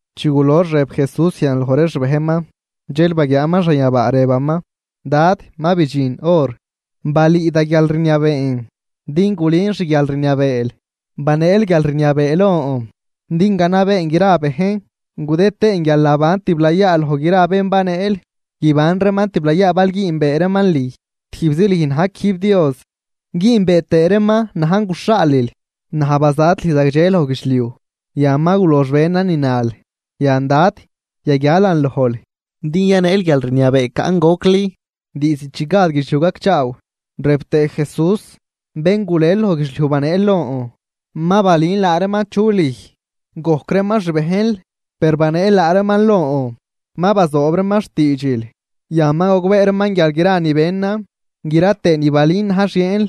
Chi gulox rëb Jesús zian loj ree xbejnman, dxel baguiaaman xanyabaa rëbaman: ―Dad, ma bidxin hor, balüü da guialrniabeen din gulün xguialrniabeel. Baneel guialrniabee lon din ganabeen gra bejn gudëd tëën guialnaban tiblayaa loj gra bén baneel. Guiban reeman tiblayaa bal güünbee reeman lüj, tijbzi lüj na̱j quijb Dios, güünbee tëë reeman najn guxhaalil. ’Naj bazat lüj zagdxe loj guidxliuj; yan ma gulox benan ni nal. Yan, Dad, yaguialan lojl, din yaneel guialrniabee caꞌn gocli, diizd chi gad guidxliuj gacchaaw. Rëb tëë Jesús: ―Bén gulel loj guidxliuj baneel lon, ma balün laa reeman chu lüj. Gojc reeman xbejnl, per baneel laa reeman lon, ma bazoob reeman xtiidxil. Yan ma gogbee reeman guial gra ni benan gra tëë ni balün na̱j xieenl.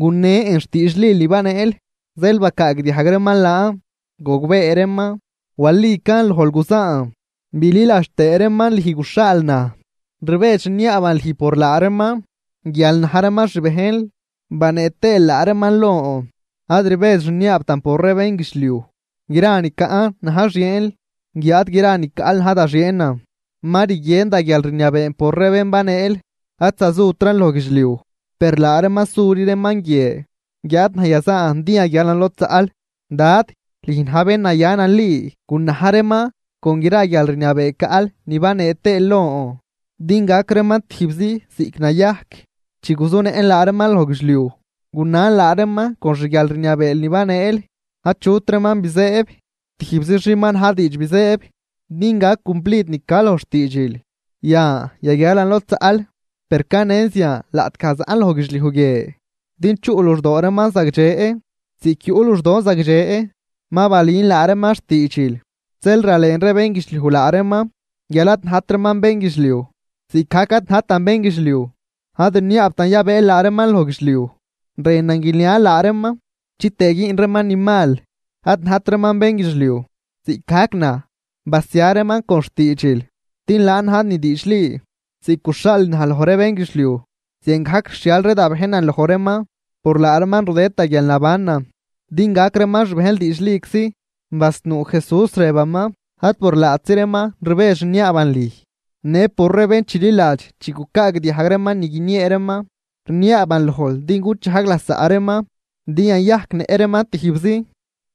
Gunen xtiidxil ni baneel, zeel bacaagdiajg reeman laan, gogbee reeman, walican lojl guzaan, bililadx tëë reeman lüj guxhaal naj. ’Rbedx rniaaban lüj por laa reeman, guial na̱j reeman xbejnl banee tëël laa reeman lon, ad rbedx rniaabtan por ree bénguidxliuj. Gra ni caꞌn na̱j xieenl, guiáad gra ni caꞌl na̱j da xieenan, ma rguien da guialrniabeen por ree bén baneel. ’Ad zazutran loj guidxliuj, per laa reeman suri reeman guie, guiáad naj yazaan din yaguialan lod zaꞌl. Dad, lüj na̱j bén naya nali, gunaj reeman con gra guialrniabee caꞌl ni banee tëël lon, din gac reeman tijbzi ziꞌc nayajc. Chi guzunëꞌn laa reeman loj guidxliuj, gunan laa reeman con xguialrniabeel ni baneel. Achut reeman bizëëb, tijbzi xin ma na̱j diidx bizëëb, din gac cumplid ni ca loj xtiidxil. ’Yan yaguialan lod zaꞌl, per canen zian laꞌtgaj zaꞌn loj guidxliuj guie, din chuꞌ luxdoo reeman zagdxe, ziꞌc yuꞌ luxdon zagdxe. Ma balün laa reeman xtiidxil, zeel ralen ree bénguidxliuj laa reeman guial ad najt reeman bénguidxliuj, ziꞌcgajc ad najtan bénguidxliuj. Ad rniaabtan yabëël laa reeman loj guidxliuj, rënan guinial laa reeman, chitëë güün reeman ni mal. Ad najt reeman bénguidxliuj, ziꞌcgajc naj. Basia reeman con xtiidxil, din laan na̱j ni diidxli. Ziꞌc guxhaalil naj loj ree bénguidxliuj, ziangajc rixhial ree da bejnan loj reeman. Por laa reeman rudëd da guialnabanan din gac reeman xbejnl diidxliczi. Basnuu Jesús, rëbaman: ―Ad por laatzi reeman rbedx rniaaban lüj, në por ree bén chililadx chi gucaagdiajg reeman ni guiniee reeman. Rniaaban lojl din guchajg lasaꞌ reeman din yayajcnëꞌ reeman tijbzi,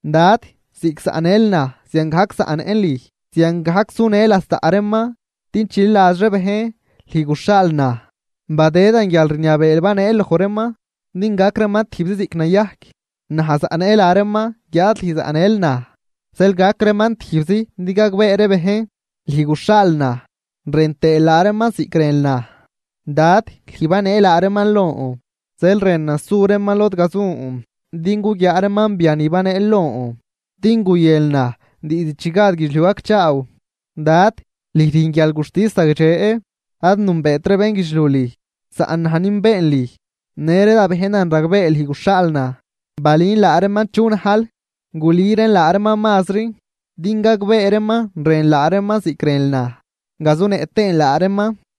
Dad, ziꞌc zaꞌnël naj ziangajc zaꞌnëꞌn lüj, ziangajc sunë lasaꞌ reeman. Din chililadx ree bejn lüj guxhaal naj. Badëdan guialrniabee baneel loj reeman, din gac reeman tijbzi ziꞌc nayajc, naj zaꞌnëꞌ laa reeman, guiáad lüj zaꞌnël naj. Zeel gac reeman tijbzi din gagbee ree bejn, lüj guxhaal naj rën tëël laa reeman ziꞌc rënl naj. ’Dad, lüj banee laa reeman lon, zeel rënan su reeman lod gazun din guguiaa reeman biani baneel lon, din guyënl naj diizd chi gad guidxliuj gacchaaw. Dad, lüj rüjn guialguxtis zagdxe. Ad nünbeet ree bénguidxliuj lüj, saꞌn naj nünbeen lüj, në ree da bejnan ragbee lüj guxhaal naj. Balün laa reeman chu najl, gulüran laa reeman mazri, din gagbee reeman rënl laa reeman ziꞌc rënl naj, gazunëꞌ tëën laa reeman.